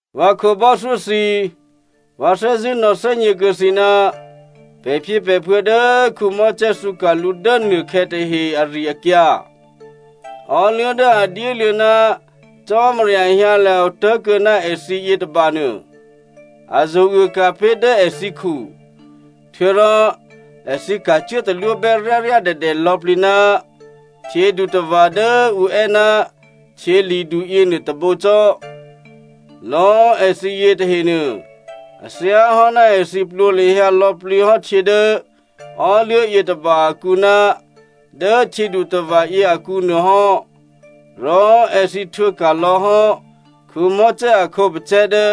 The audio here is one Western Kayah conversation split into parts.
Vǎ khǒbò́thyó thǐ꤮! Vǎ thè́zṳ̂́ nò̌thè́gně kuô̌ thǐ ná pè̤phyěpè̤phuô̌ dố Mosè thǔka̤ lǔ dố nuôkhè̌ tahe ari-akyǎ. Ò́luố̤ dố a dyéluô̌ ná Cò́marya hyǎlya̤ otố̤kuô̌ ná èthǐ yětôba nuô, a zo̤uôka̤ pé̤ dố èthǐkhu. Htuô̌rò èthǐ ka̤cuố talwóbè́ ryáryádèdè lò̌plǐ ná htyědutava̤ dố ǔ è́ ná htyěli̤du yěnuô tôbǒ cò́. Lò̌꤮ èthǐ yětahenuô a thyáhò́ ná èthǐ plwǒ lahyǎ lò̌plǐ hò́ htyě dố ò́luố̤ yětôba akǔ ná dố htyědutava̤ yě akǔnuô hò́, rò èthǐ htwǒ ka̤lò̌ hò́ Mosè a khǒpacè̤̌ dố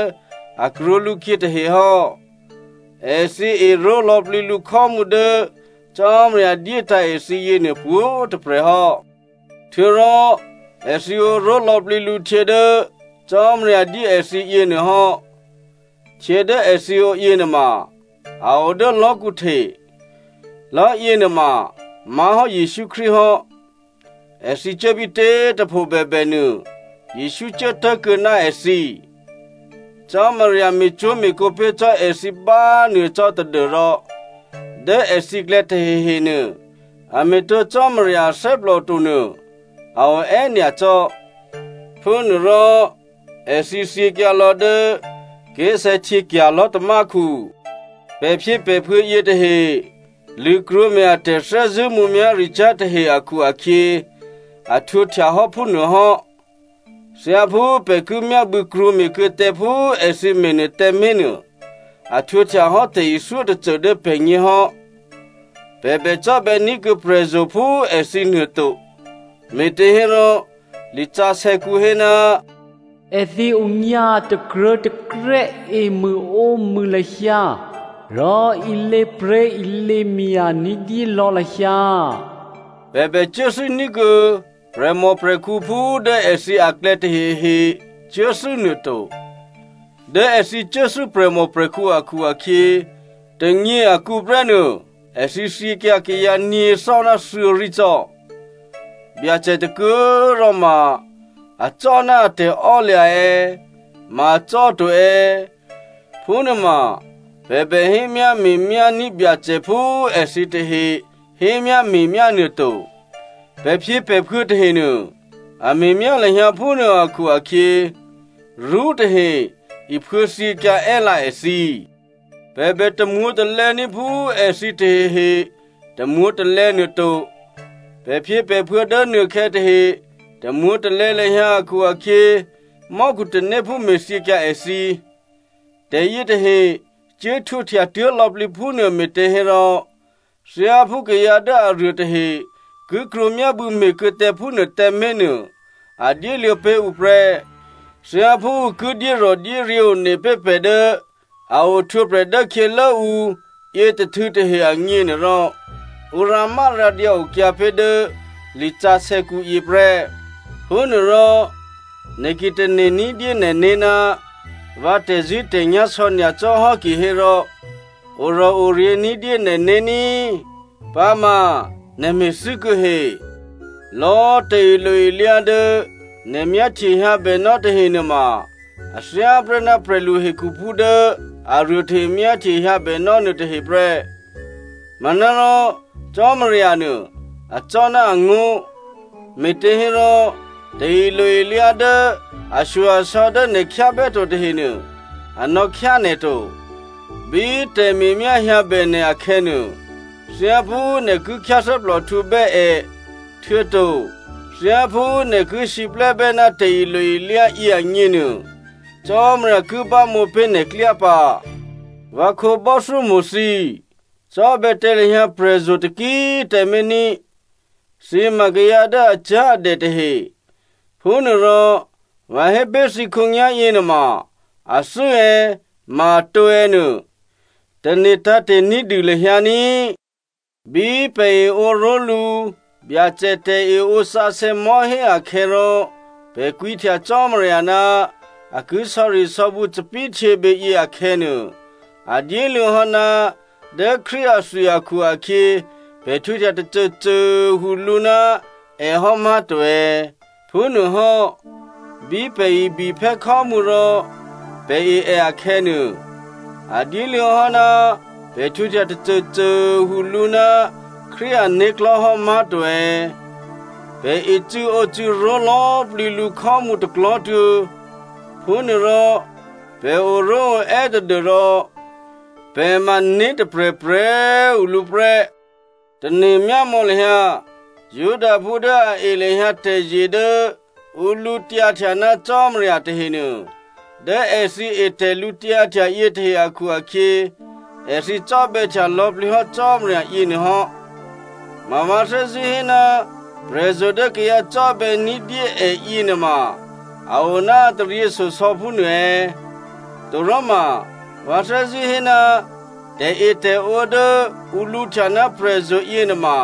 a krwǒ lǔkhyě tahe hò́. Èthǐ eró̤ lò̌plǐ lǔ khò́mǔ dố Cò́marya dyétǎ̤ èthǐ yěnuô pwǒ̤꤮ tôprè̤ hò́. Htuô̌rò èthǐ ǒró̤ lò̌plǐ lǔ htyě dố Cò́marya dyé èthǐ yěnuô hò́. Htyě dố èthǐ ǒ yěnuôma a o dố lò̤́kǔ hte. Lò̤́ yěnuôma má̤hò́ Jesǔ Krístu hò́. Èthǐ cuố bítě꤮ tôpho bèbè nuô, Jesǔ cuố tố̤kuô̌ ná èthǐ. Cò́marya me̤cwó̤me̤kǒ pé̤ cò́ èthǐ bánuô cò́ tadû́rò dố èthǐklè̌ tahehenuô a me̤ tǒ Cò́marya athè́plò to nuô a o è́nyacò́. Phúnuôrò èthǐ thyěkyǎ lò̌ dố ké̤sè̌htyěkya̤ lò̤́tamákhu. Pè̤phyěpè̤phuô̌ yětahe lṳ̂krwǒme̤ a tè̤thè́zṳ̂́ mǔmyá̤ricyá̤ tahe akhu-akhyě a htwǒhtya hò́ phúnuô hò́. Thyáphú pè̤ ki myábû̌ krwǒme̤kuô̌ tǎ phú èthǐ me̤nuô tǎmé̤ nuô, a htwǒhtya hò́ tè̤ithyó tôcô dố pè̤gně hò́. Pè̤ bè cò́bè̌ní̤kuô̌ prè̤zo̤ phú èthǐ nuô to. Me̤těhérò lisǎsè̌kǔ hé, “Èthǐ onyǎ takruô̤̌takrè́ emṳ̂ǒmṳ̂ lahyǎ rò ilěpré̤ilěmya̤ ní̤dyé lò̌ lahyǎ.” Pè̤ bè cuốthû́ ní̤kuô̌ prè̤mòprè̤khǔ phú dố èthǐ aklè̌ tahehe cuố thû́ nuô to. Dố èthǐ cuốthû́ prè̤mòprè̤khǔ akhu-akhyě, tônyě akǔ prè́ nuô, èthǐ thyěkyǎ kayǎ nyě̤thò́ ná thuô̌rí cò́. Byacè tôkuô꤮ rò ma acò́ ná a tè̤ò́lya̤ è̌, ma acò́ to è̌ phúnuôma pè̤ bè hémyáme̤myá ní̤ Byacè phú èthǐ tahe hémyáme̤myá nuô to. Pè̤phyěpè̤phuô̌ tahenuô a me̤myá lahyǎ phúnuô akhu-akhyě, rṳ́ tahe iphuô̌ thyěkyǎ è́lǎ èthǐ. Pè̤ bè tamwǒ̤talè̌ní̤ phú èthǐ tahehe tamwǒ̤talè̌ nuô to. Pè̤phyěpè̤phuô̌ dố nuôkhè̌ tahe tamwǒ̤talè̌ lahyǎ akhu-akhyě, mò́khu tanéphú me̤thyěkyǎ èthǐ. Tè̤yětahe cuố htwǒhtya tuố̤ lò̌plǐ phúnuô me̤těhérò thyáphú kayǎ dố aruô tahe ki krwǒ myábû̌ me̤kuô̌ tǎ phúnuô tǎmé̤ nuô, a dyéluô̌ pé̤ ǔ prè́. Thyáphú ǔ ki dyérò̤dyéryě̤ one pé̤ pè̤ dố a ohtwǒprè̤ dố khyělố ǔ yětôhtû̌ tahe agněnuôrò, ǔ rǎmárǎdyǎ okyǎ pé̤ dố lisǎsè̌kǔ yěprè́. Phúnuôrò nè̤ ki tane̤ ní̤dyé nè̤né̤ ná vǎ tè̤zṳ̂́tè̤nyá̤ sò̌ nyacò́ hò́ kihérò, orò̤oryě̤ ní̤dyé nè̤né̤ ní꤮, pǎma nè̤ me̤thû́ kuô̌ he. Lò̌ tè̤ilo-ilyá dố nè̤ myáhtye hyǎbènò́ tahe nuôma a thyá prè́ ná prè̤lu hekhuphú dố aruô tahe myáhtye hyǎbènò́ nuôtahe prè́. Manárò Cò́marya nuô acò́ ná angó̤, me̤těhérò tè̤ilo-ilyá dố ashyo-asò̌ dố nè̤ khyábè́ to tahenuô, a nò̌khyá nè̤ to. Bí tè̤me̤myá hyǎbè nè̤ akhè̌nuô, thyáphú nè̤ ki khyáthè́plòhtǔbè́ è, htuô̌to thyáphú nè̤ ki siplè́bè́ ná tè̤ilo-ilyá yě agněnuô, Cò́marya ki bámǒ pé̤ nè̤ klyá pǎ. Vǎ khǒbò́thyómo̤ thǐ, cò́bè̌ tǎ lahyǎ prè̤zo̤ taki꤮ tǎmé̤ ní꤮. Thǐ ma kayǎ dố acyá̤adè tahe. Phúnuôrò vǎ hé pé̤ thǐ khǒnyá̤yě nuôma athû́ è̌ ma atǒ è̌ nuô tane̤ tǎ̤te̤ ní̤dû lahyǎ ní꤮. Bí pè̤ eǒ ró̤lǔ Byacè tè̤eǒ sǎsè̌ mò̤́hé akhè̌ rò pè̤ kwǐhtya Cò́marya ná a ki sò̌risò̌bǔ thòbǐthèhtyěbě yě akhè̌nuô, a dyéluô̌ hò́ ná dố Krístu athwi akhu-akhyě, pè̤ htwǒhtya tôcôcô꤮ tuô̌ lǔ ná è hò́ má̤to è̌? Phúnuôhò́ bí pè̤ ibiphè́ khò́mǔ rò pè̤ e è akhè̌nuô, a dyéluô̌ hò́ ná pè̤ htwǒhtya tôcôcô꤮ tuô̌ lǔ ná Krístu ané̤klò̤́ hò́, má̤to è̌? Pè̤ ecû̌ǒcû̌ ró̤ lò̌plǐ lǔ khò́mǔ tôklò̤́tuô̌. Phúnuôrò pè̤ oró̤oè́ tadû́rò pè̤ ma né̤ tôprè̤prè̤꤮ tuô̌ lǔ prè́. Tane̤myámò̌ lahyǎ Judaphú dố a e lahyǎ tè̤zye dố ǔ lǔtyǎhtya ná Cò́marya tahenuô. Dố èthǐ e tè̤lǔtyǎhtya yětahe akhu-akhyě, èthǐ cò́bè̌htya lò̌plǐ hò́ Cò́marya yěnuô hò́. Ma vǎ thè́zṳ̂́ hé ná prè̤zo̤ dố kayǎ cò́bè̌ ní̤dyé è yěnuôma a o ná a taryěshyosò̌ phúnuô è̌? Toròma vǎ thè́zṳ̂́ hé ná tè̤etè̤ǒ dố ǔ lǔhtya ná prè̤zo̤ yěnuôma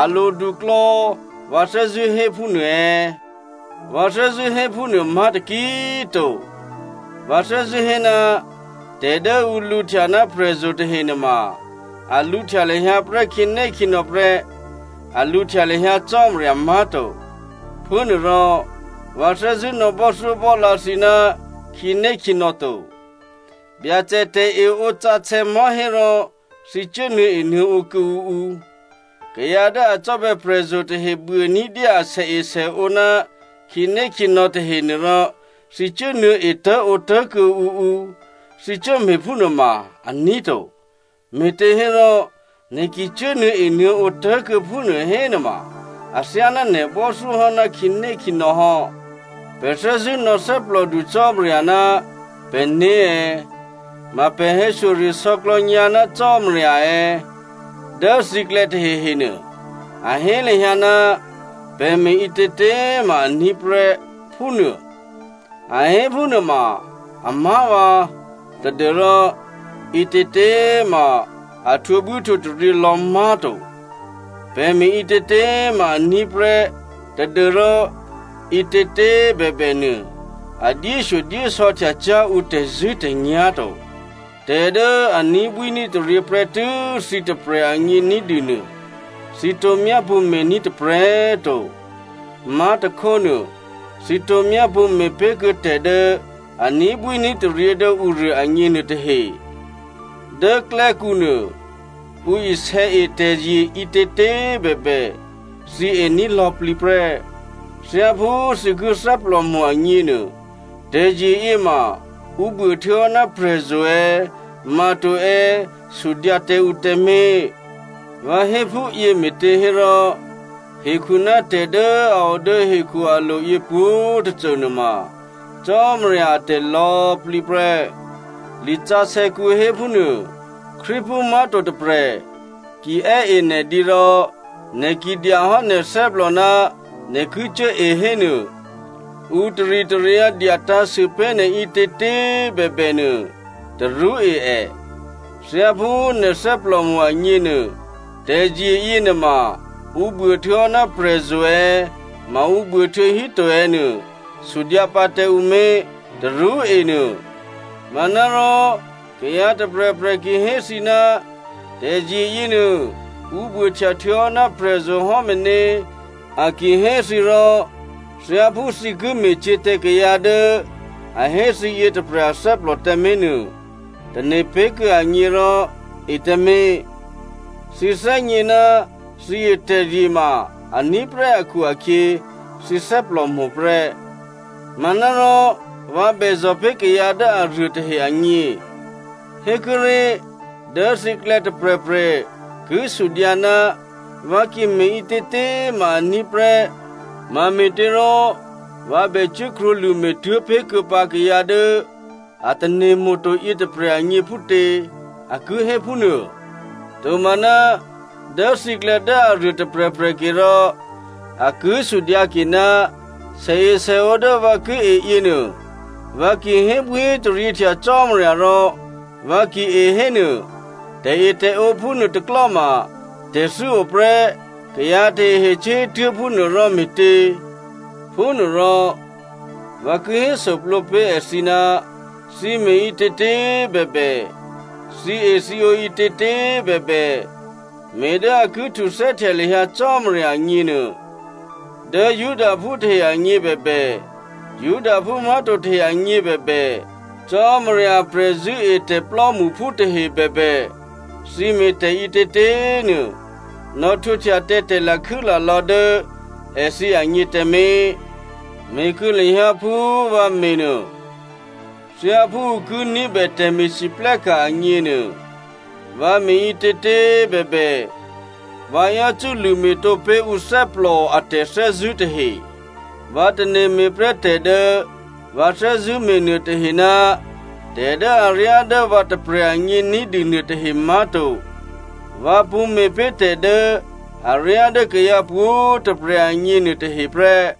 a lodu klò̌, vǎ thè́zṳ̂́ hé phúnuô è̌? Vǎ thè́zṳ̂́ hé phúnuô má̤ taki꤮ to. Vǎ thè́zṳ̂́ hé ná tè̤ dố ǔ lǔhtya ná prè̤zo̤ tahe nuôma a lǔhtya lahyǎ prè́ khǐnékhǐnò̌ prè́, a lǔhtya lahyǎ Cò́marya má̤to. Phúnuôrò vǎ thè́zṳ̂́ nò̌ bò́thyóbò́lǎ thǐ ná khǐnékhǐnò̌ to. Byacè tè̤eǒsǎsè̌ mò̤́hé rò thǐ cuố nuô̌enuô̌ǒ kuô̌ǔ ǔ, kayǎ dố a cò́bè̌ prè̤zo̤ tahe buô ní̤dyé asèesèǒ ná khǐnékhǐnò̌ tahenuô rò thǐ cuốnuô̌ etố̤ǒtố̤kuô̌ǔ ǔ, thǐ cuố me̤phúnuô ma, aní̤ to. Me̤těhérò, nè̤ ki cuố nuô̌enuô̌ǒ tố̤kuô̌ phúnuô hénuôma athyáná nè̤ bò́thyó hò́ ná khǐnékhǐnò̌ hò́. Pè̤ thè́zṳ̂́ nò̌ thè́plòdu Cò́marya ná pè̤né̤ è̌? Ma pè̤ hè̌shyoresò̌klò̌ nyǎ ná Cò́marya è̌? Dố thǐklè̌ tahehenuô a hé lahyǎ, “Pè̤ me̤ ǐtětě꤮ ma aní̤ prè́,” phúnuô. A hé phúnuôma amá̤vǎ tadû́rò ǐtětě ma a htwǒbwíhtwǒtaryě lò̌ má̤to. “Pè̤ me̤ ǐtětě ma aní̤ prè́,” tadû́rò ǐtětě꤮ bèbè nuô, a dyéshyodyésò̌htya cyá̤ ǔ tè̤zṳ̂́tè̤nyá̤ to. Tè̤ dố a ní̤bwíní̤taryě prè́tû́ thǐ tôprè̤ agně ní̤dû nuô, thǐ tǒ myápṳ̌ me̤ní̤ tôprè̤꤮ to. Má̤tôkhónuô, thǐ tǒ myápṳ̌ me̤pé̤ kuô̌ tè̤ dố a ní̤bwíní̤taryě dố ǔruô agněnuô tahe. Dố klè́kǔ nuô, ǔ isè̌ e tè̤zye ǐtětě꤮ bèbè, thǐ ení̤ lò̌plǐ prè́. Thyáphú thǐ ki thè́plòmo̤ agněnuô, tè̤zye yěma ǔ buô htuô̌hò́ ná prè̤zo̤ è̌, ma to è̌ sudyǎ tǎ ǔ tǎmé̤. Vǎ hé phúyě me̤těhérò, “Hekhu ná tè̤ dố a o dố hekhu alo̤yě pwǒ̤꤮ tôcô nuôma Cò́marya atè̤ lò̌꤮ plǐ prè́,” lisǎsè̌kǔ hé phúnuô. Krístuphú má̤to tôprè̤ ki è́ e nè̤ dǐ rò nè̤ ki dya hò́ nè̤ thè́plò ná nè̤ ki cuố e hénuô, ǔ taritaryǎ dyatǎ̤sû pé̤ nè̤ ǐtětě꤮ bèbè nuô, tarú e è. Thyáphú nè̤ thè́plòmo̤ agněnuô, tè̤zye yěnuôma ǔ buô htuô̌hò́ ná prè̤zo̤ è̌ ma ǔ buô htuô̌ híto è̌ nuô, sudyǎ pǎ tǎ ǔ mé̤, tarú enuô. Manárò kayǎ tôprè̤prè̤ ki hé thǐ, “Tè̤zye yěnuô ǔ buôhtya htuô̌hò́ ná prè̤zo̤ hò́ meně,” a ki hé thǐ rò, thyáphú thǐ ki me̤cyě̤ tǎ kayǎ dố a hé thǐ yětôprè̤ athè́plò tǎmé̤ nuô, tane̤ pé̤ kuô̌ ègně rò e tǎmé̤. Thǐ thè́gně ná thǐ e tè̤zye ma aní̤ prè́ akhu-akhyě, thǐ thè́plòmo̤ prè́. Manárò vǎ bèzò̤ pé̤ kayǎ dố aruô tahe agně. Hékuốré̤, dố thǐklè̌ tôprè̤prè̤ ki sudyǎ, “Vǎ ki me̤ ǐtětě꤮ ma aní̤ prè́, mame̤těrò vǎ bècuố krwǒlṳ̂me̤ tuố̤ pé̤ kuô̌pǎ kayǎ dố a tane̤mo̤ to yětôprè̤ agně phútě?” A ki hé phúnuô. Tomaná, dố thǐklè̌ dố aruô tôprè̤prè̤ ke rò a ki sudyǎke, “Sèesèǒ dố vǎ ki e yěnuô, vǎ ki hébwíhétaryěhtya Cò́marya rò vǎ ki e hénuô, tè̤etè̤ǒ phúnuô tôklò́ma tè̤thû́ o prè́ kayǎ tahehe cuố hé tuố̤ phúnuô rò me̤tě?” Phúnuôrò, vǎ ki hésûplǒ pé̤ èthǐ, thǐ me̤ ǐtětě꤮ bèbè, thǐethǐǒ ǐtětě꤮ bèbè, me̤ dố ǔ ki htuthè́htya lahyǎ Cò́marya agně nuô. Dố Judaphú tahe agně bèbè, Judaphú má̤to tahe agně bèbè, Cò́marya a prè̤zṳ̂́etè̤ plò́mṳphú tahe bèbè, thǐ me̤ tè̤ ǐtětě꤮ nuô nò̌htwǒhtya tǎ tè̤lakhû́lalò̌ dố èthǐ agně tǎmé̤. Me̤kuô̌ lahyǎ phú vǎ me̤ nuô. Thyáphú ǔ ki ní̤bè tè̤me̤lwóhteka̤ agněnuô, vǎ me̤ ǐtětě꤮ bèbè, vǎ yácû́ lṳ̂me̤tǒ pé̤ ǔ thè́plò a tè̤thè́zṳ̂́ tahe. Vǎ tane̤ me̤ prè́ tè̤ dố vǎ thè́zṳ̂́ me̤ nuôtahe ná tè̤ dố aryá dố vǎ tôprè̤ agně ní̤dû nuôtahe má̤to. Vǎ pṳ̌ me̤pé̤ tè̤ dố aryá dố kayǎ pwǒ̤꤮ tôprè̤ agně nuôtahe prè́.